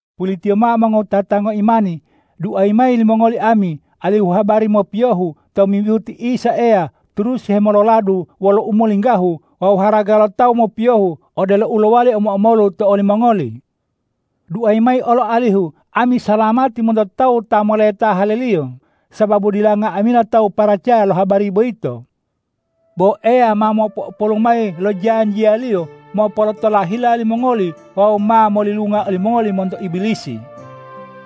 Pulitiyo mao mongowutata ngoimani, duayi mayi limongoli ami alihu habari mopiyohu tomimbihu ti Isa Eya turusi hemololadu wolo umolinggahu wawu haraga lo tawu mopiyohu, odelo u lowali omo-omolu to olimongoli. Duayi mayi olo alihu ami salamati monto tawu ta moleta haleliyo, sababu dila nga'amila tawu paracaya lo habari boyito. Bo Eya ma mopo'opolu mayi lo janjiya-Liyo, mopolotola hila limongoli wawu ma molilunga olimongoli monto Ibilisi.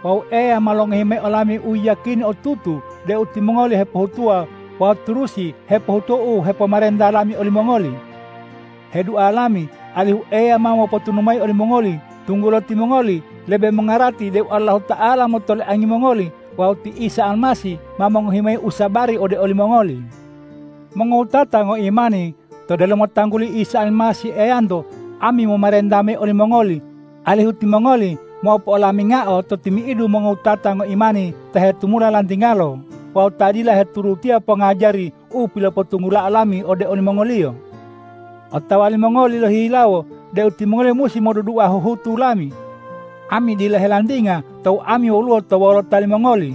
Wawu Eya ma longohi mayi olami uyiyakini otutu deu timongoli hepohutuwa wawu turusi hepohutuwa u hepomarenta lami olimongoli. Hedua lami alihu Eya ma mopotunu mayi olimongoli, tunggulo timongoli lebe mongarati deu Allahuta'ala motoliangi mongoli wawu ti Isa Almasih ma mongohi mayi usabari ode olimongoli. Mongowutata ngoimani, to delomo tangguli Isa Almasih Eyanto, ami momarenta mayi olimongoli, alihu timongoli mopo'olamingao to timi'idu mongowutata ngoimani ta hetumula lantingalo wawu ta dila heturutiya pongajari u pilopotunggulao lami ode olimongoliyo. Otawa limongoli lohihilawo deu timongoli musi modudua huhutu lami. Ami dila helantinga tou ami woluwo to wolota limongoli.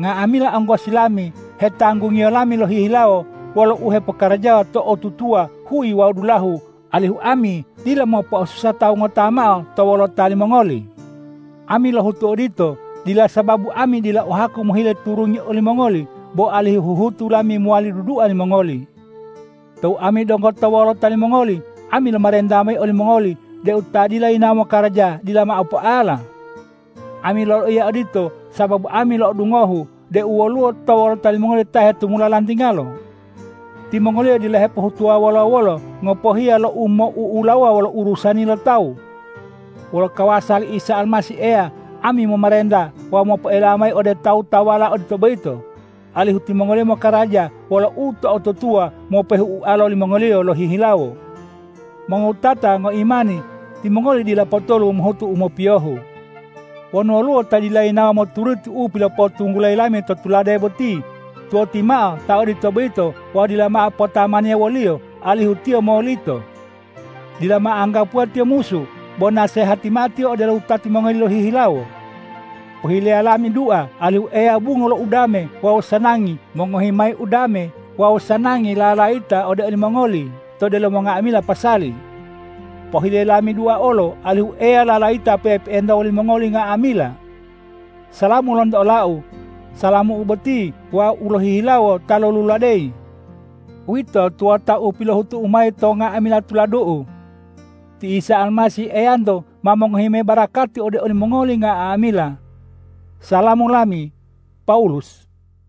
Nga'amila onggosi lami hetanggungiyo lami lohihilawo wolo u hepokarajawa to'otutuwa huyi wawu dulahu, alihu ami dila mopo'osusa tawu ngota mao to wolota limongoli. Ami lohutu odito, dila sababu ami dila o haku mohile turungi olimongoli, bo alihu huhutu lami mowali dudua limongoli. Tou ami donggo to wolota limongoli, ami lomarenta mayi olimongoli deu ta dila yinawo mokaraja dila mao poala. Ami loloiya odito sababu ami lo'odungohu deu woluwo to wolota limongoli ta hetumula lantingalo. Timongoliyo dila hepohutuwa wolo-wolo, ngopohiya lo umou'ulawuwa wolo urusani lo tawu. Wolo kawasa li Isa Almasih Eya ami momarenta wawu mopoela mayi ode tawu-tawuwala odito boyito, alihu timongoliyo mokaraja wolo uto'otutuwa mopehu ualo limongoliyo lohihilawo. Mongowutata ngoimani, timongoli dila potolu mohutu u mopiyohu. Wonu woluwo ta dila yinawo moturuti u pilopotunggulayi lami to tulade boti, tuwoti mao ta odito boyito wawu dila mao potamaniya woliyo, alihu tiyo molito. Dila mao anggapuwa tiyo musu, bo nasehati mao tiyo odelo wutati mongoli lohihilawo. Pohileya lami dua, alihu Eya bungo lo udame wawu sanangi mongohi mayi udame wawu sanangi lalayita ode olimongoli to delomo nga'amila pasali. Pohileya lami dua olo, alihu Eya lalayita pe'epe'enta wolimongoli nga'amila. Salamu lonto olau. Salamu boti wau lohihilawo ta loluladeyi. Uwito tuwota u pilohutu'u mayi to nga'amila tuladu'u. Ti Isa Almasih Eyanto ma mongohi mayi barakati ode olimongoli nga'amila. Salamu lami, Pawulus